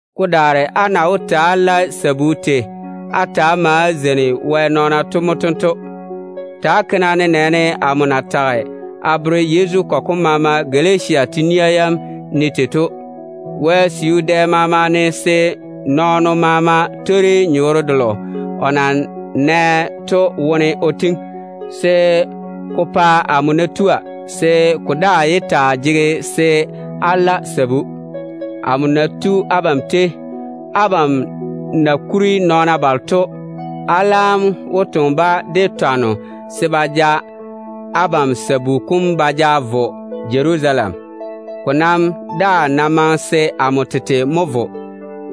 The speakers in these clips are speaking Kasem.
Ko daare á na wó ta‑á lae sabu tei á ma á zeini Wɛ nɔɔna to mo tento. Ta‑á ke-na nenɛɛne amo na tage a bere Yezu kɔgɔ kolo maama na wo Galatia te-nia yam ne se ba taa ke tei to. Wɛ siu dɛ maama ne se nɔɔno maama twori nyɔɔre delo o na nɛ to wone o tiŋi, se ko pa amo ná tua, se ko daa yé taa jege se á la sabu. Amo ná tu abam tei, a laam wó toŋe á na kuri nɔɔna balo to de twanno, se ba ja á sabu kom ba ja vo Jerusalem. Ko nam daa ná maŋe se amo tete mo vo,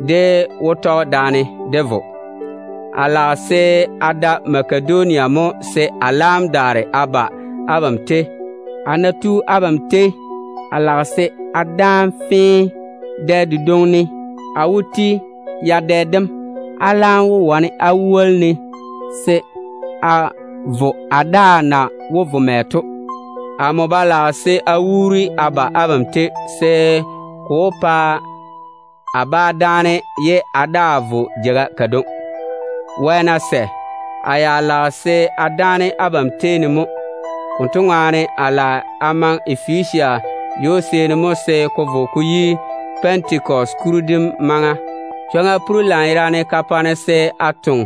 dé wó tɔge daane dé vo. A lage se a da Makedonia mo se a laam daare a ba abam tei. Amo ná tua, a lage se a dáane fee abam tei ne. Dɛ dedwoŋi ne a wó ti yadɛ dem. Abam laam wó wane á woli-ne se a vo a daa na wó vo mɛ to. Amo ba lage se a wuuri a ba a na abam, se ko bá pa-ne chwoŋa se a dáane ye a daa vo jeiga kadwoŋi. Wɛ ná sɛ, a ya lage se a dáane abam tei ne mo. Konto ŋwaane, a lage a maŋe Efesia ywo-seeni mo se ko vo ko yi Pɛntekɔse kuri dem maŋa. Chwoŋa pore lanyerane ka pa-ne se a taa toŋe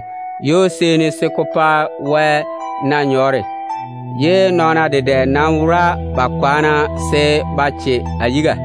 ywo-seeni de dam, ye nɔɔna dedɛ nam wora ba kwaana se ba che a yiga.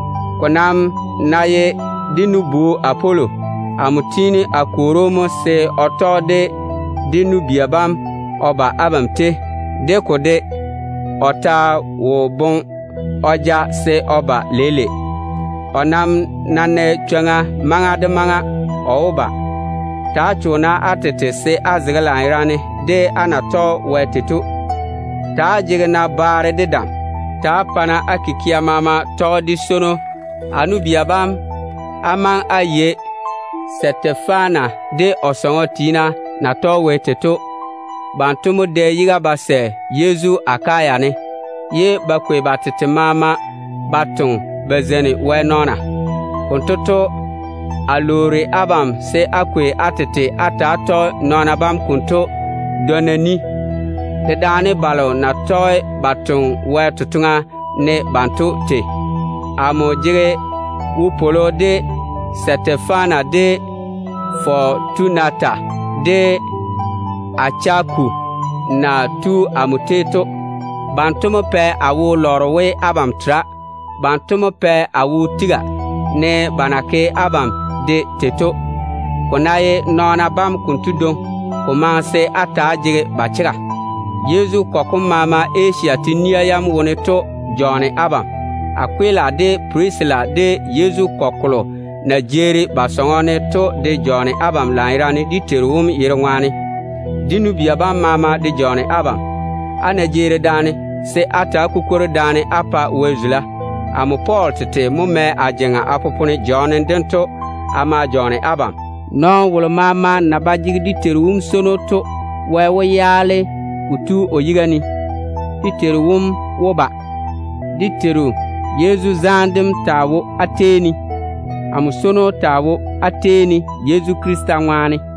Ko nam ná ye dé nu-bu Apolo, amo tiini a kwoori‑o mo se o tɔge de dé nu-bia bam o ba abam tei. De ko de, o ta wo boŋe o ja se o ba leile. O nam ná nɛ chwoŋa maŋa de maŋa, o wó ba. Ta‑á cho-na á tete se á fɔge á zege lanyerane de á na tɔge Wɛ chega kam tei to. Ta‑á jege-na baare de dam. Ta‑á pa-na á kikia maama tɔge de swono. A nu-bia bam, á maŋe á yei Stefana de o sɔŋɔ tiina na yɔɔre ba tɔge Wɛ tei to. Banto mo dɛ yiga ba sɛ Yezu Akaya ne, ye ba kwei ba tete maama ba toŋe ba zeini Wɛ nɔɔna. Konto to, a lwoori abam se á kwei á tete á ta‑á tɔge nɔɔna bam konto dwonna ni, dedaane balo na tɔge ba toŋe Wɛ totoŋa ne banto tei. Amo jege wopwolo de Stefana, de Fɔtunata, de Achaku na tu amo tei to. Banto mo pɛ a wo lɔre we abam tera. Banto mo pɛ a wo tiga, ne ba na ke abam de tei to. Ko ná ye nɔɔna bam konto dwoŋi, ko maŋe se á ta‑á jege ba chega. Yezu kɔgɔ kom maama na wo Asia te-nia yam wone to jɔɔne abam. Akwila de Pirisila, de Yezu kɔgɔ kolo na jeeri ba sɔŋɔ ne to de jɔɔne abam lanyerane dé Teiru wom yere ŋwaane. Dé nu-bia bam maama de jɔɔne abam. Á ná jeeri daane, se á ta‑á kukwori daane Wɛ ŋwaane. Amo Pɔɔl tete mo mɛ a jeŋa a popone jɔɔnem dento a ma jɔɔne abam. Nɔɔno wolo maama ná ba jege dé Teiru wom swono, Wɛ wó yaale kotu o yiga ne. Dé Teiru wom wó ba. Dé Teiru Yezu zaane dem taa wo á tei ne. Amo swono taa wo á tei ne Yezu Krista ŋwaane.